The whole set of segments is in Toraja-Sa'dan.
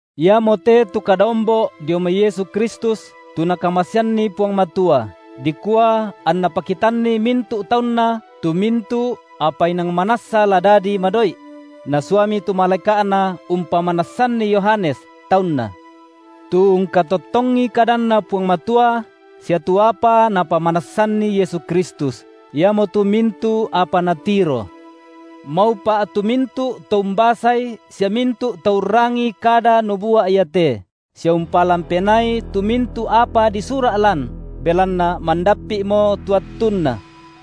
Iamote tu kada ombo’ dio mai Yesu Kristus, tu NakamaseanNi Puang Matua, dikua anNa pakitanni mintu’ taunNa tu mintu’ apa inang manassa la dadi madoi’: Nasuami tu malaeka’Na umpamanassanni Yohanes, taunNa. Tu ungkatottongi kadanNa Puang Matua sia tu apa napamanassanNi Yesu Kristus, iamotu mintu’ apa natiro. Maupa’ tu mintu’ to umbasai sia mintu’ to urrangii kada nubua’ iate, sia umpalan penaai tu mintu’ apa disura’ lan, belanna mandappi’mo tu attunna.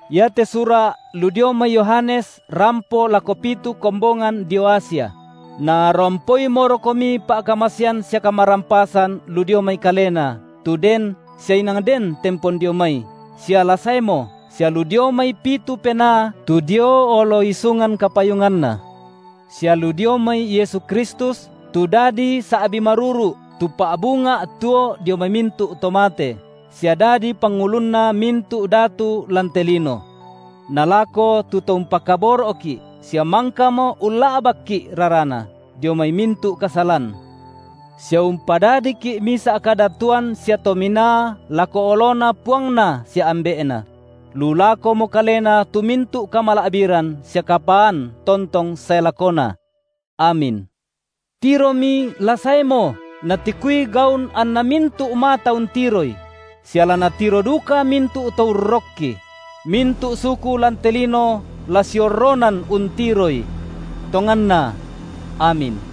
Iate sura’ lu dio mai Yohanes rampo lako pitu kombongan dio Asia: narampoimorokomi pa’kamasean sia kamarampasan lu dio mai Kalena, tu Den, sia inang Den tempon dio mai, sia la saemo, sia lu dio mai pitu penaa tu dio olo isungan kapayunganNa; sia lu dio mai Yesu Kristus, tu dadi sa’bi maruru’, tu pa’bunga’ tuo dio mai mintu’ to mate, sia dadi Pangulunna mintu’ datu lan te lino. Nalako tu To-umpakaboro’ki’, sia mangkamo ulla’bakki’ raraNa, dio mai mintu’ kasalan, sia umpadadiki’ misa’ kadatuan sia tominaa lako oloNa PuangNa sia Ambe’Na; lu lakomo Kalena tu mintu’ kamala’biran sia kapaan tontong sae lakona. Amin. Tiromi la saeMo, natikui gaun anna mintu’ mata untiroI; sia la natiro duka mintu’ to urrokKi; mintu’ suku lan te lino la siorronan untiroI. Tonganna, amin.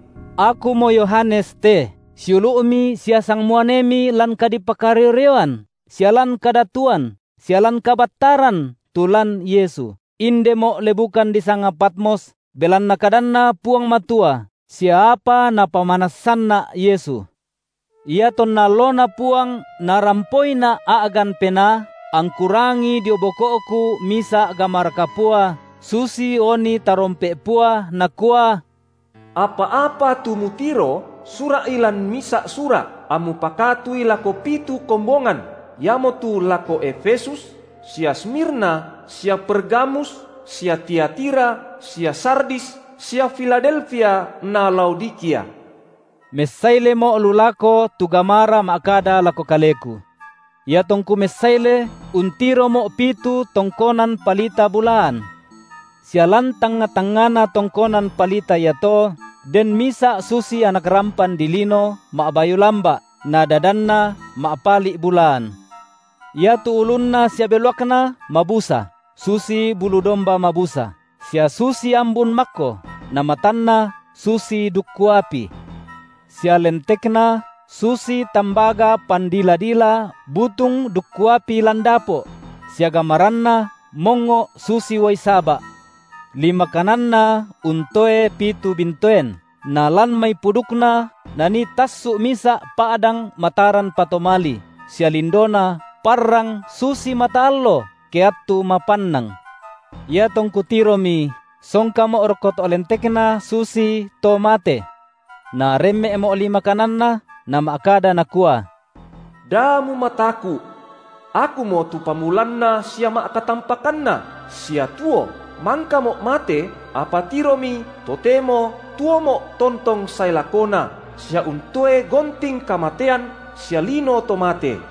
Akumo Yohanes te, siulu’mi sia sangmuanemi lan kadipakario-rioan sia lan Kadatuan sia lan kabattaran tu lan Yesu, indemo’ lebukan disanga Patmos, belanna kadanNa Puang Matua sia apa Napamanassanna’ Yesu. Iatonna alloNa Puang narampoina’ a’gan Penaa, angku rangii dio boko’ku misa’ gamara kapua, susi oni tarompe’ pua, nakua: Apa-apa tu mutiro, sura’i lan misa’ sura’, ammu pakatui lako pitu kombongan, iamotu lako Efesus, sia Smirna, sia Pergamus, sia Tiatira, sia Sardis, sia Filadelfia na Laodikia. Messailemo’ lu lako tu gamara ma’kada lako kaleku. Iatongku messaile untiromo’ pitu tongkonan palita bulaan. Sia lan tangnga-tangngana tongkonan palita iato den misa’ susi Anak rampan dilino, ma’bayu lamba’, na dadanNa ma’pali’ bulaan. Iatu ulunNa sia beluakNa mabusa, susi bulu domba mabusa, sia susi ambun makko; na matanNa susi dukku api. Sia lentekNa susi tambaga pandila-dila butung dukku api lan dapo’; sia gamaranNa mongngo’ susi uai saba’. Lima kananNa untoe pitu bintoen, nalan mai pudukNa nanii tassu’ misa’ pa’dang mataran patomali, sia lindoNa parrang susi mata allo ke attu mapannang. Iatongku tiromi, songkamo’ rokko to’ lentekNa susito mate. Naremme’mo’ lima kananNa, nama’kada Nakua: Da mumataku’. Akumo tu pamulanna sia ma’katampakanna, sia tuo. MangkaMo’ mate, apa tiromi, totemo tuoMo’ tontong sae lakona, sia untoe gonting kamatean sia lino to mate.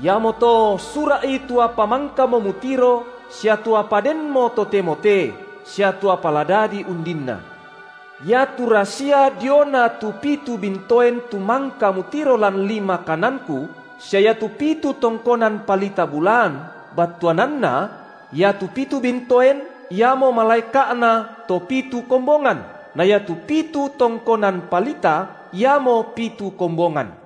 Iamoto sura’i tu apa mangkamo mutiro sia tu apa denmo totemo te, sia tu apa la dadi undinna. Iatu rasia diona tu pitu bintoen tu mangka mutiro lan lima kananKu, sia iatu pitu tongkonan palita bulaan battuananna: iatu pitu bintoen iamo malaeka’na to pitu kombongan, na iatu pitu tongkonan palita, iamo pitu kombongan.